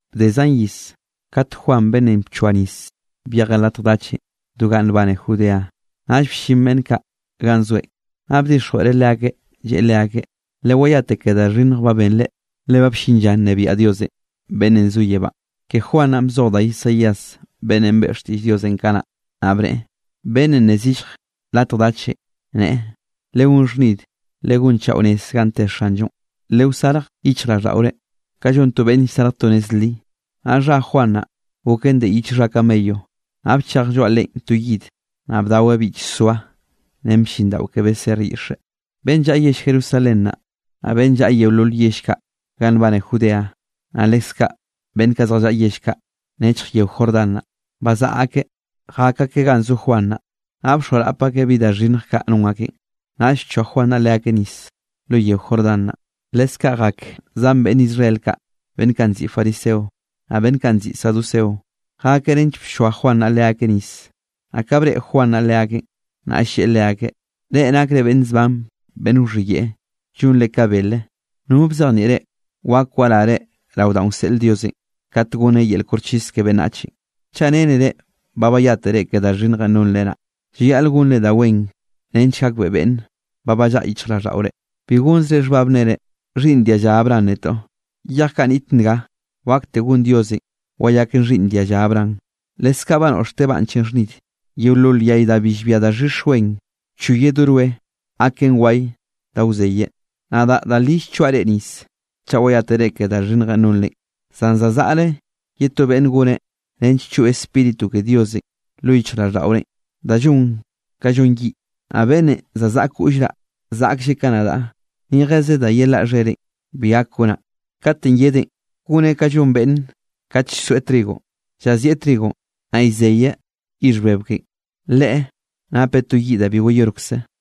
Bde zan iz, kate Juan beꞌnnenꞌ bchoa nisenꞌ byejeꞌ latj dachenꞌ do ganꞌ nbane Judea. Naꞌll bllin beꞌnn kaꞌ ganꞌ zoeꞌn, naꞌ bdixjweꞌreꞌ leakeꞌ, lleꞌe leakeꞌ: —Lewayate ke da xhinnj ba benre, le ba bllin lla nnebiaꞌ Dios beꞌnnenꞌ zo yebánꞌ. Ke Juan naꞌ bzoj da Isaías beꞌnnenꞌ beꞌe xtiꞌll Diosenꞌ kanaꞌ, naꞌ bneꞌe: Beꞌnnenꞌ nne zillj latj dachenꞌ, neꞌe: “¡Legón xhnid, legonchaꞌo nez ganꞌ te Xanllonꞌ, lewsarj yichjraꞌlldaꞌore ka llon to beꞌnn llsarj to nez li!” Naꞌ xha Juan naꞌ goken de yich xha camello, naꞌ bchej lloaꞌ leꞌen to yid, naꞌ bdaweꞌ bichsoa ren blliꞌndaꞌo ke beser yiꞌxe. Beꞌnn llaꞌa yell Jerusalén naꞌ, naꞌ beꞌnn llaꞌa yeolol yell kaꞌ ganꞌ nbane Judea, naꞌ leskaꞌ beꞌnn kaꞌ zjallaꞌa yell kaꞌ nechj yeo Jordán naꞌ, bazaꞌa akeꞌ jak akeꞌ ganꞌ zo Juan naꞌ. Naꞌ bxoarap akeꞌ bi da xhinnj kaꞌ non akeꞌn, naꞌll bchoa Juan naꞌ leakeꞌ nis lo yeo Jordán naꞌ. Leskaꞌ jak zan beꞌnn Israel kaꞌ beꞌnn kaꞌ nziꞌi fariseo, naꞌ beꞌnn kaꞌ nziꞌi saduceo. Jakeꞌ nench bchoa Juan naꞌ leakeꞌ nis. Naꞌ ka breꞌe Juan naꞌ leakeꞌn, naꞌll lleꞌe leakeꞌ: —¡Reꞌ nakre beꞌnn zban beꞌnn wxhiyeꞌe, llonre ka bele! ¿No bzejnieꞌ reꞌ, wak warare rao danꞌ wseꞌl Diosenꞌ katenꞌ goneꞌ yel koxchis ke beꞌnnachenꞌ? Chaꞌ rennere ba bayátere ke da xhinnjenꞌ nonre naꞌ, llayaꞌl gonre da wen nench gakbeꞌe beꞌnne ba ballaꞌa yichjraꞌlldaꞌore. Bi gonzre xhbab nnere: “Xhiꞌnn dia lla Abraham netoꞌ.” Yej kaꞌ niꞌt nga, wakte gon Diosenꞌ wayaken xhiꞌnn dialla Abraham. Leskaꞌ ba noꞌxteꞌ banchenꞌ xhnid, yeolol yay da bi llbia daxhix wen, wchoyeꞌ do roe, gaken waye da wzeyeꞌ. Nadaꞌ da li llchoaꞌ reꞌ nis chaꞌ wayátere ke da xhinnjenꞌ nonre, zan za zaꞌre ye to beꞌnne goneꞌ nench choꞌ Spíritu ke Diosenꞌ lo yichjraꞌlldaꞌorenꞌ, da llon ka llon yiꞌ. Naꞌ beꞌnnenꞌ za zaꞌa koꞌllraꞌ zaꞌklleꞌ ka nadaꞌ, ni jeze da yelaꞌ xhereꞌn bi gak gonaꞌ. Katenꞌ yedeꞌn, goneꞌ ka llon beꞌnn kate llsoeꞌ trigo, llazieꞌ trigonꞌ, naꞌ llzeyeꞌ yixh bebe ken. Leꞌe napeꞌ to yiꞌ da bi wayorkze.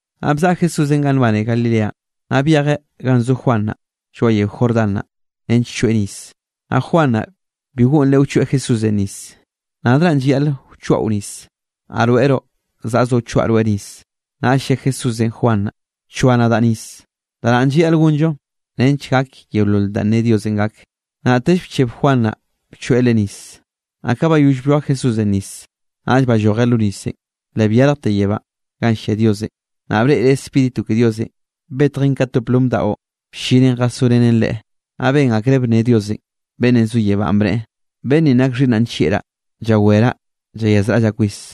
Naꞌ bzaꞌa Jesúsenꞌ ganꞌ nbane Galilea, naꞌ byejeꞌ ganꞌ zo Juan naꞌ lloaꞌ yeo Jordán naꞌ, nench choeꞌ nis. Naꞌ Juan naꞌ bi goꞌnreꞌ wchoeꞌ Jesúsenꞌ nis, lleꞌe Leꞌe: —Nadraꞌn llayaꞌl wchoaꞌo nis, naꞌ rweꞌroꞌ zaꞌzoꞌ wchoaꞌ rweꞌ nis. Naꞌll lle Jesúsenꞌ Juan naꞌ: —Bchoa nadaꞌ nis. Da naꞌn llayaꞌl gonllo nench gak yeolol danꞌ ne Diosenꞌ gak. Naꞌtell bcheb Juan naꞌ bchoeꞌ Leꞌe nis. Naꞌ ka bayoll blloa Jesúsenꞌ nis, naꞌll ballojeꞌ lo nisenꞌ, le byarjte yebánꞌ ganꞌ llia Diosenꞌ, naꞌ breꞌreꞌ Spíritu ke Diosenꞌ, betjen ka to plom daꞌo, bllinen jasorenen Leꞌe. Naꞌ ben akreꞌ bnne Diosenꞌ beꞌnnenꞌ zo yebánꞌ, bneꞌe: —Beꞌnn ninꞌ nak xhiꞌnnaꞌ nllieꞌraꞌ, llaweraꞌ llayazraꞌllaꞌ kwis.